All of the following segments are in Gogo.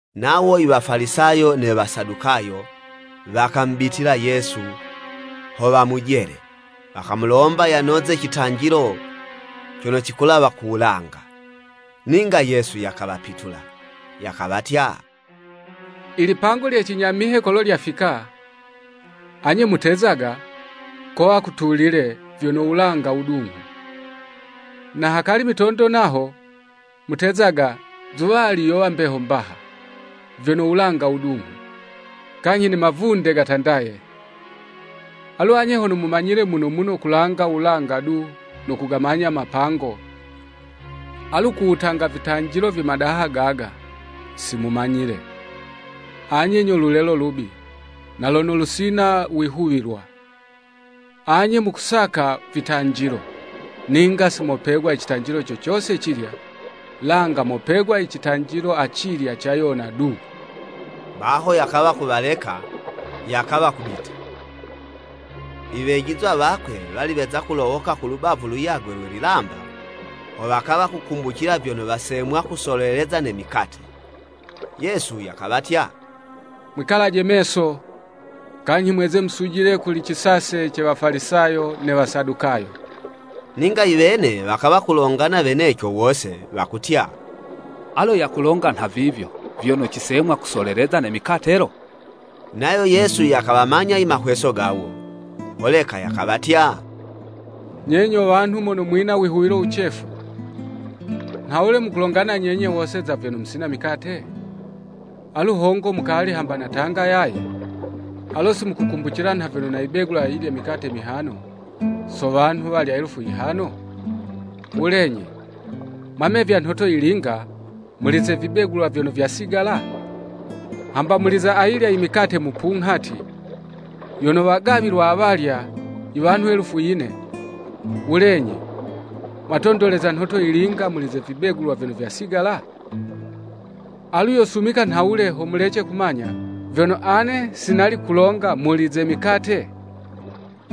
Nawo i Wafalisayo ne Wasadukayo, wakamubitila Yesu, ho wamujele, wakamulomba yanoze citanjilo cono cikulawa ku wulanga. Ninga Yesu yakawapitula, yakawatya, “Ilipango lye cinyamihe kolo lyafika, anye mutezaga, ‘Kowa kutulile vyono wulanga wudunghu!’ Na hakali mitondo naho, mutezaga, ‘Zuwali yowa mbeho mbaha, vyono wulanga wudunghu, kanyhi ne mavunde gatandaye!’ Alu anye hono mumanyile muno muno kulanga wulanga du no kugamanya mapango, alu ku wutanga vitanjilo vye madaha gaga, si mumanyile. Anye nyo lulelo lubi na lono lusina wihuwilwa. Anye mukusaka vitanjilo, ninga si mopegwa i citanjilo co cose cilya, langa mopegwa i citanjilo acilya ca Yona du.” Baho yakawa kuwaleka, yakawa kubita. Iwejizwa wakwe wali weza kulowoka ku lubavu luyagwe lwe lilamba, ho wakawa kukumbucila vyono wasemwa kusoleleza ne mikate. Yesu yakawatya, “Mwikalaje meso, kanyhi mweze musujile kuli cisase ce Wafalisayo ne Wasadukayo!” Ninga iwene wakawa kulongana weneco wose, wakutya, “Alo yakulonga nha vivyo vyono cisemwa kusoleleza ne mikate lo.” Nayo Yesu yakawamanya i mahweso gawo, holeka yakawatya, “Nye nyo wanhu mono mwina u wihuwilo wucefu! Nhawule mukulongana nyenye wose za vyono musina mikate? Alu hongo mukali hamba natanga yaye? Alo si mukukumbucila nha vyono nayibegula ayilya i mikate mihano so wanhu walya elufu yihano? Wulenyi, mwamevya nhoto yilinga muli ze vibegulwa vyono vyasigala? Hamba muli za ayilya i mikate mupunghati yono wagawilwa wa walya i wanhu elufu yine, wulenyi, mwatondoleza nhoto yilinga muli vibegulwa vyono vyasigala? Alu yosumika nhawule ho mulece kumanya, vyono ane si nali kulonga muli ze mikate?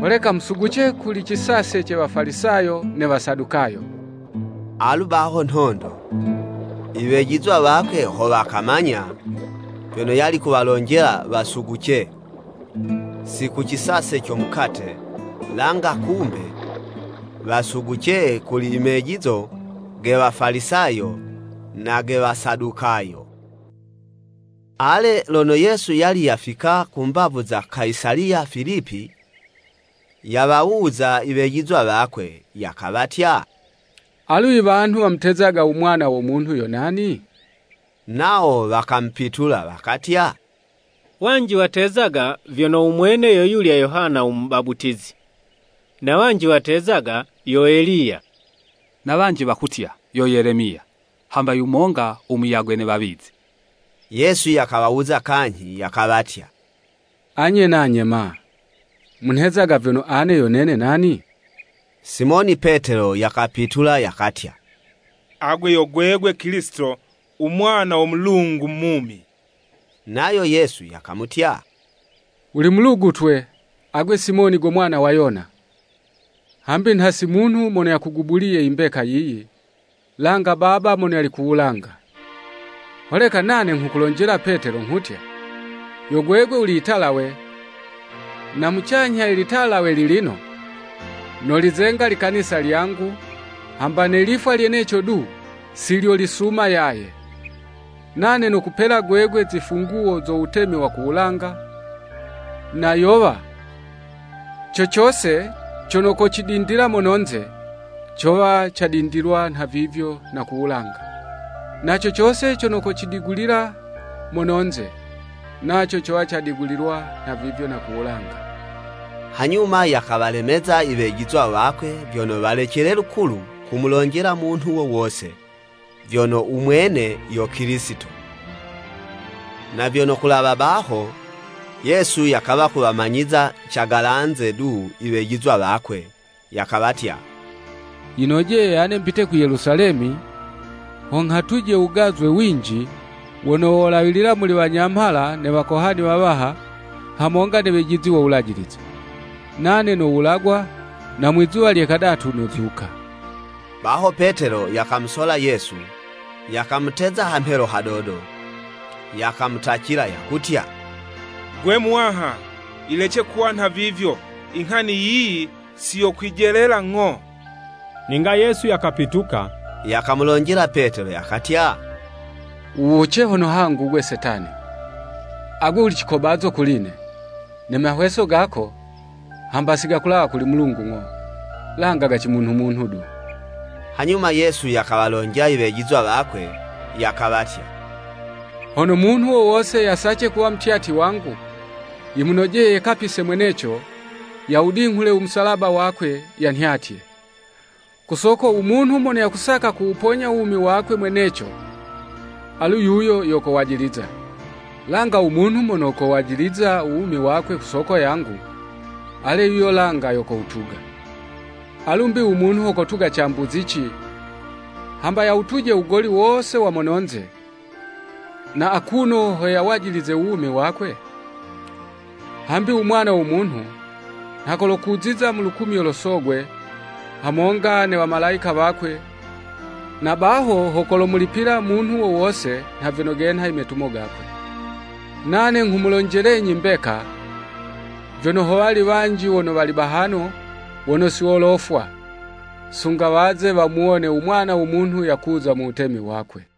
Holeka musuguce kuli cisase ce Wafalisayo ne Wasadukayo!” Alu baho nhondo, iwejizwa wakwe ho wakamanya, vyono yali kuwalonjela wasuguce, si ku cisase co mukate, langa kumbe, wasuguce kuli i mejizo ge Wafalisayo na ge Wasadukayo. Ale lono Yesu yali yafika ku mbavu za Kayisaliya Filipi, yawawuza i wejizwa wakwe, yakawatya, “Alu i wanhu wamutezaga u Mwana wo Munhu yo nani?” Nawo wakamupitula, wakatya, “Wanji watezaga vyono u mwene yo yulya Yohana u Mubaputizi, na wanji watezaga yo Eliya, na wanji wakutya, yo Yelemiya hamba yumonga u muyagwe ne wawizi.” Yesu yakawawuza kanyhi yakawatya, “Anye nanye ma, munhezaga vyono ane yo nene nani?” Simoni Petelo yakapitula yakatya, “Agwe yo gwegwe Kilisito u Mwana wo Mulungu mumi.” Nayo Yesu yakamutya, “Wuli mulugutwe, agwe Simoni go mwana wa Yona, hambi nha si munhu mono yakugubuliye i mbeka yiyi, langa Baba mono yali ku wulanga. Holeka nane nghukulonjela Petelo nghutya, yo gwegwe wuli italawe, na mucanyha ye 'talawe lilino, nolizenga likanisa lyangu, hamba ne lifwa lyeneco du, si lyolisuma yaye. Nane nokupela gwegwe zifunguwo zo wutemi wa ku wulanga, na yowa, co cose cono kocidindila mono'nze, cowa cadindilwa nhavivyo na ku wulanga, na co cose cono kocidigulila mono'nze, naco cowa cadigulilwa nhavivyo na ku wulanga.” Hanyuma yakawalemeza i wejizwa wakwe vyono walecele lukulu kumulonjela munhu wo wose vyono u mwene yo Kilisito. Na vyono kulawa baho, Yesu yakawa kuwamanyiza cagalanze du i wejizwa wakwe, yakawatya, “Yinojeye ane mbite ku Yelusalemi ho nghatuje wugazwe winji wono wolawilila muli wanyamhala ne Wakohani wawaha, hamonga ne wejizi wo Wulajilize. Nane nowulagwa na mwi'zuwa lye kadatu, nozuka.” Baho Petelo yakamusola Yesu, yakamuteza hamhelo hadodo, yakamutacila, yakutya, “Gwe Muwaha, yilece kuwa nhavivyo! Inghani yiyi si yo kwijelela ng'o.” Ninga Yesu yakapituka, yakamulonjela Petelo yakatya, “Wuwuce hono hangu 'gwe Setani! Agwe wuli cikobazo kuli'ne. Ne mahweso gako, hamba si gakulawa kuli Mulungu ng'o, langa ga cimunhu-munhu du!” Hanyuma Yesu yakawalonjela i wejizwa wakwe, yakawatya, “Hono munhu wo wose yasace kuwa mutyatyi wangu, yimunojeye yekapise mweneco, yawudinghule u musalaba wakwe, yanhyatye. Ku soko u munhu mono yakusaka kuwuponya u wumi wakwe mweneco, alu yuyo yo kowajiliza, langa u munhu mono kowajiliza u wumi wakwe ku soko yangu, ale yuyo langa yo kowutuga. Alu mbi u munhu ho kotuga cambuzici, hamba yawutuje u wugoli wose wa mononze, na akuno ho yawajilize u wumi wakwe? Hambi u Mwana wo Munhu nha kolokuziza mu lukumyo lo Sogwe, hamonga ne wamalayika wakwe, na baho ho kolomulipila munhu wo wose nha vyono genha imetumo gakwe. Nane nghumulonjelenyi mbeka, vyono howali wanji wono wali bahano wono si wolofwa, sunga waze wamuwone u Mwana wo Munhu yakuza mu Wutemi wakwe.”